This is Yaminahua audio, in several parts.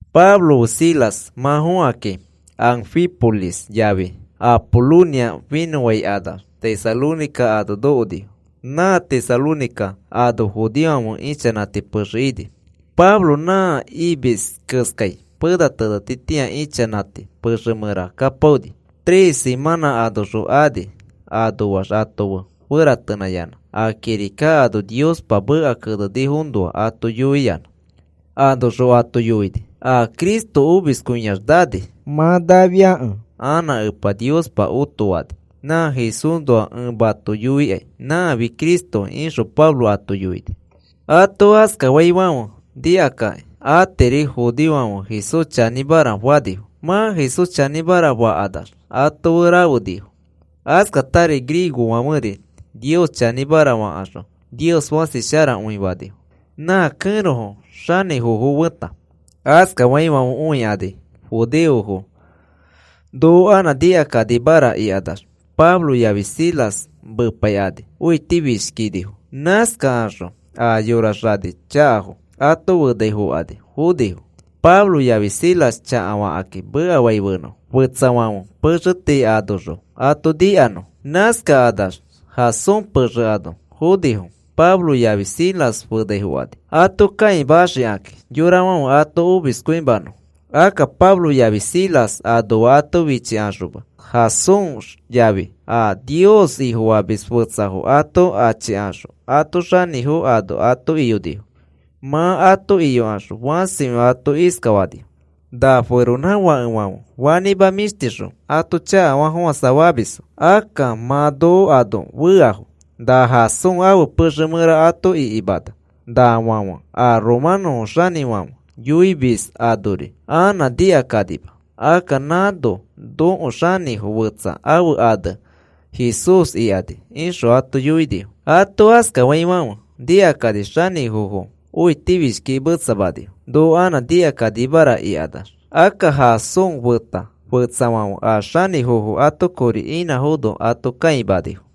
Pablo fe Silas mã fokakĩ, Anfípolis yafi Apolonia finõfãikanax, Tesalónica ano nokonifo. Nã Tesalónica ano judeofãfe ichanãti pexe ini. Pablo nã imis keskai pena tenetitĩa ichanãti pexe mẽra kapaoni. Tres simãnã anoxõ ani, anoax ato fe feratenãyanã a kirika ano Niospa meka kenenifoõnoa ato yoiyãna. Anoxõ ato yoini: “A Cristo omiskõiax nani. Mã nafiakẽ anã Epa Niospa otoani. Nã Jesúsnoa ẽ mato yoikai nãfi Cristoki,” ixõ Pablo ato yoini. Ato askafaifãfe nikakakĩ atiri judeofãfe Jesús chanĩmara fanifo. Mã Jesús chanĩmara fakanax ato fe rafenifo. Askatari griegofãferi Nios chanĩmara fakaxõ Nios fãsi sharakõi fanifo, nã kẽrofo xanĩfofo feta. Askaifãfe õikani judeofo noko anã nikakanimaraka ikanax, Pablo yafi Silas mepaikani õitifishkinifo. Nãskakaxõ a yora xani chakafo ato fenaifokani fonifo, Pablo yafi Silas chakafakakĩ mekafanõfo, fetsafãfe pexefo tii anoxõ ato nikanõfo. Nãskakanax Jasón pexe ano fonifo Pablo yafi Silas fenaifokani, ato kãimaxikakĩ yorafãfe ato omiskõimanõfo. Akka Pablo yafi Silas anoa ato fichikaxoma, Jasón yafi a Nios Ifofamis fetsafo ato achikaxõ ãto xanĩfofo ano ato iyonifo. Mã ato iyokaxõ fãsikõi ato iskafanifo: “Na feronãfakefãfe fanĩma mĩshtixõ ato chakafafofãsafamisfo. Akka mã noko ano feafo. Na Jasón ãfe pexe mẽra ato ikimana. Nafãfe a romanõ xanĩfãfe yoimis anori anã nikakanima. Akka nãno nõko xanĩfo fetsa ãfe ane Jesús ikani,” ixõ ato yoinifo. Ato askafaifãfe nikakani xanĩfofo õitifishkikĩ metsamanifo, noko anã nikakanimara ikanax. Akka Jasón feta fetsafãfe a xanĩfofo ato kori inãfono ato kãimanifo.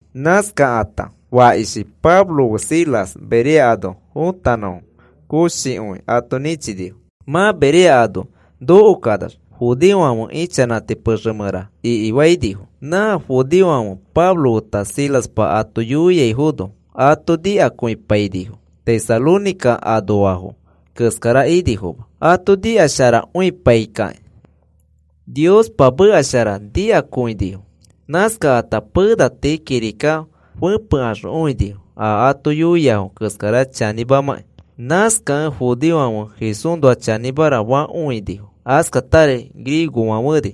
Nãskakata fakishi Pablo fe Silas Berea ano fotanõfo koshikõi ato nĩchinifo. Mã Berea ano nokokanax judeofãfe ichanãti pexe mẽra ikifainifo. Nã judeofãfe Pablo feta Silaspa ato yoiaifono ato nikakõipainifo, Tesalónica anoafo keskara inifoma. Ato nikasharapaikõikakĩ Niospa meka shara nikakõinifo. Nãskakata pena tii kirika fepekaxõ õinifo a ato yoiafo keskara chanĩmamãkĩ. Nãskakẽ judeofãfe Jesúsnoa chanĩmara fakõinifo. Askatari griegofãferi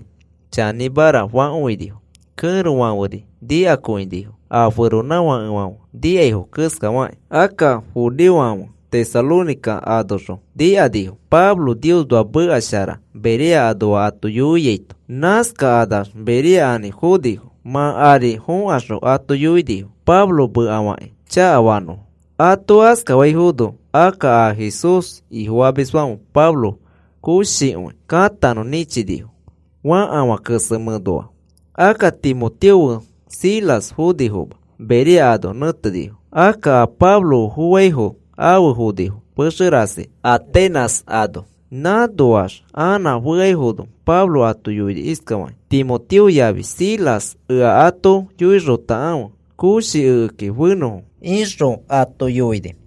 chanĩmara fakõinifo. Kẽrofãferi nikakõinifo a feronãfakefãfe nikaifo keskafakĩ. Akka judeofãfe Tesalónica anoxõ nikanifo Pablo Niosnoa meka shara Berea anoafo ato yoiaito. Nãskakanax Berea ari fonifo, mã ari fokaxõ ato yoinifo Pablo mekafakĩ chakafanõfo. Ato askafaifono, akka a Jesús Ifofamisfãfe Pablo koshikõi katanõ nĩchinifo fakafã kesemẽ ano. Akka Timoteo fe Silas fonifoma. Berea ano nẽtenifo. Akka a Pablo fe fofaifo, afe fonifo pexe rasi Atenas ano. Nãnoax anã feaifono Pablo ato yoini iskafakĩ: “Timoteo yafi Silas ea ato yoixotakãfe koshi ekeki fenõfo,” ixõ ato yoini.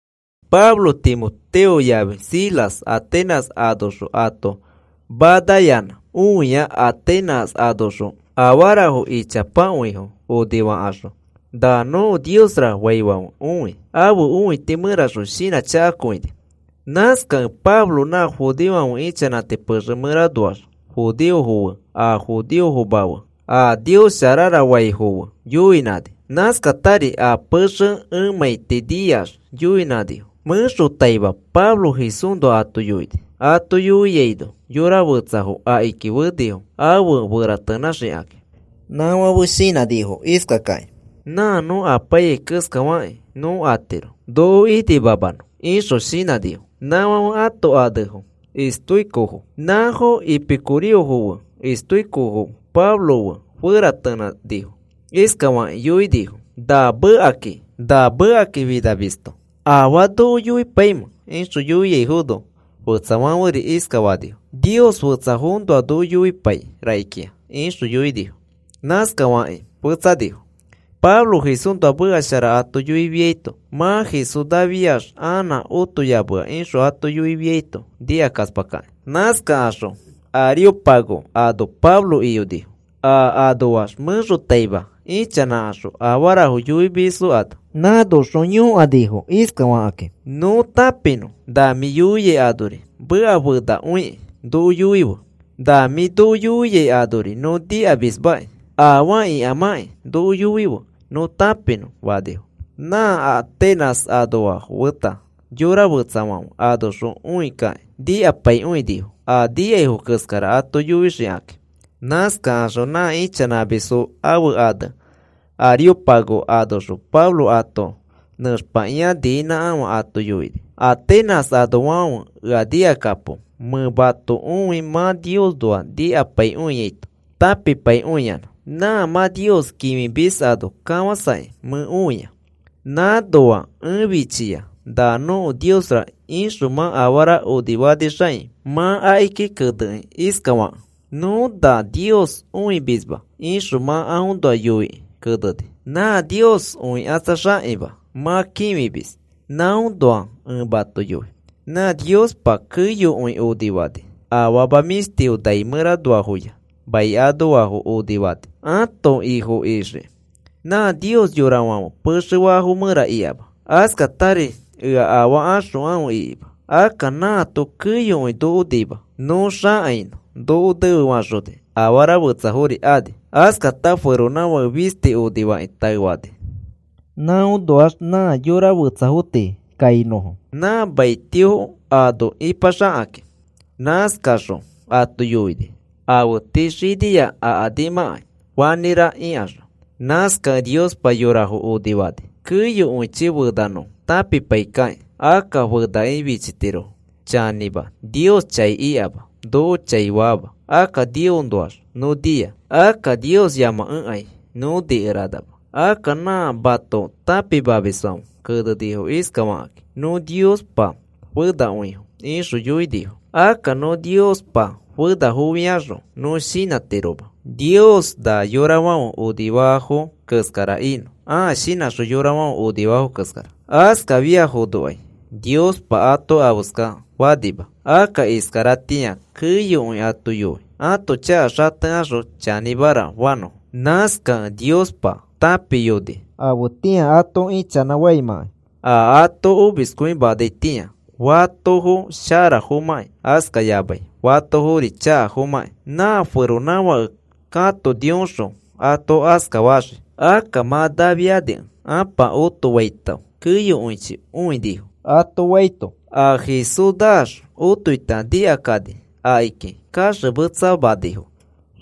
Pablo Timoteo yafi Silas Atenas anoxõ ato manayanã õia Atenas anoxõ afarafo ichapakõifo onifakaxõ, “Na nõko niosra,” faifãfe õi. Ãfe õiti mẽraxõ shinãchakakõini. Nãskakẽ Pablo nã judeofãfe ichanãti pexe mẽranoax judeofo fe a judeofoma fe a Nios sharara faifo fe yoinãni. Nãskatari a pexe emãiti niax yoinãifo mẽxotaima Pablo Jesúsnoa ato yoini. Ato yoiaino yora fetsafo akiki fenifo afe feratenãxikaki. Nãfãfe shinãnifo iskakakĩ: “Nã nõ apaiyai keskafakĩ nõ atiro noko inimamanõ,” ixõ shinãnifo. Nãfãfe ãto anefo epicureofo. Ranãri iskanifo: “Afara afeskara afiaino nõ tenetiro,” ixõ shinãnifo. Nãfãfe ãto anefo estóicofo. Nãfo epicureofo fe estóicofo Pablo fe feratenãnifo. Iskafakĩ yoinifo: “Na mekakĩ finamisto ¿afaa noko yoipaimẽ?” ixõ yoiaifono, fetsafãferi iskafanifo: “Nios fetsafoõnoa noko yoipai rakikĩa,” ixõ yoinifo. Nãskafakĩ fetsanifo. Pablo Jesúsnoa meka shara ato yoifiaito, mã Jesús nafiax anã otoyamea ixõ ato yoifiaito nikakaspakakĩ. Nãskakaxõ Areópago ano Pablo iyonifo a anoax mẽxotaima ichanãkaxõ afarafo yoimisfo ano. Nãnoxõ yõkanifo iskafakakĩ: “Nõ tãpinõ na mĩ yoiai anori meka fenakõiki noko yoife. Na mĩ noko yoiai anori nõ nikamismaki. Afaa ikamãkĩ noko yoife nõ tãpinõ,” fanifo. Nã Atenas anoafo feta yora fetsafãfe anoxõ õikakĩ nikapaikõinifo a nikaifo keskara ato yoixikakĩ. Nãskaxõ nã ichanãmisfo ãfe ane Areópago anoxõ Pablo ato nẽxpakĩa niinãkãfe ato yoini: “Atenas anoafãfe, ea nikakapo, mẽ mato õi mã Niosnoa nikapaikõiaito tãpipaikõiyanã. Nã mã nios kĩfimis ano kafasakĩ mẽ õia. Nãnoa ẽ fichia na nõko niosra ixõ mã afara onifanixakĩ mã akiki kenekĩ iskafakẽ: ‘Nõ na nios õimisma,’ ixõ mã aõnoa yoikĩ keneni. Nã nios õikatsaxakĩma mã kĩfimis, nãõnoa ẽ mato yoi. “Nã Niospa keyokõi onifani, afama mĩshtifo nai mẽranoafoya mai anoafo onifani ato Ifo ixikĩ. Nã Nios yorafãfe pexe faafo mẽra ikama. Askatari ea afaa axokãfe ikima. Akka nãato keyokõi noko nima. Nõ xakainõ noko nefefaxoni, afara fetsafori ani. “Askata feronãfake fisti onifakĩ taefani, nãnoax nã maniafo tii kainõfo, nã mai tio ano ipaxakakĩ. Nãskaxõ ato yoini, afe tii xinia akanimãkai fanĩra ikaxõ. Nãskakẽ Niospa yorafo onifani keyokõichi fenanõfo tãpipaikakĩ. Akka fenakĩ fichitirofo. Chanĩma, Nios chai ikama, noko chai faama. Akka Niosnoax nõ nia. Akka Niosyamakẽkai nõ nikeranama. Akka nã mato tãpimamisfãfe kenenifo iskafakakĩ: ‘Nõ Niospa fenakõifo,’ ixõ yoinifo. Akka nõ Niospa fenafofiaxõ, nõ shinãtiroma Nios na yorafãfe afarafo onifaafo keskara inõ, ãa shinãxõ yorafãfe onifaafo keskara. Askafiaifonokai Niospa ato afeska fanima. Akka iskaratĩa keyokõi ato yoi ãto chaka xatekaxõ chanĩmara fanõfo. Nãskakẽ Niospa tãpiyoni afetĩa ato ichanãfaimãkai, a ato omiskõimanaitĩa, fatofo sharafomãkĩ askayamai fatofori chakafomãkĩ. Nã feronãfake katonioxõ ato askafaxii. Akka mã nafiakẽ Ãpa otofaito keyokõichi õinifo,” ato faito, a Jesús naax otoita nikakani, akiki kaxemetsamanifo.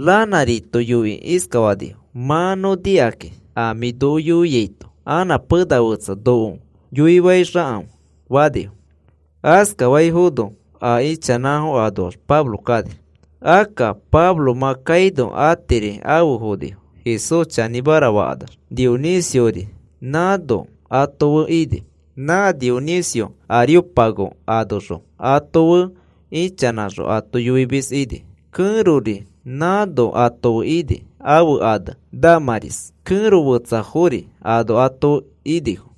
Ranãrito yoikĩ iskafanifo: “Mã nõ nikakĩ a mĩ noko yoiaito, anã pena fetsa noko yoifaixãfe,” fanifo. Askafaifono a ichanãfo anoax Pablo kani. Akka Pablo mã kaino atiri afe fonifo Jesús chanĩmara fakanax. Dionisiori nãno ato fe ini, nã Dionisio Areópago anoxõ ato fe ichanãxõ ato yoimis ini. Kẽrori nãno ato fe ini, ãfe ane Dámaris, kẽro fetsafori ano ato fe inifo.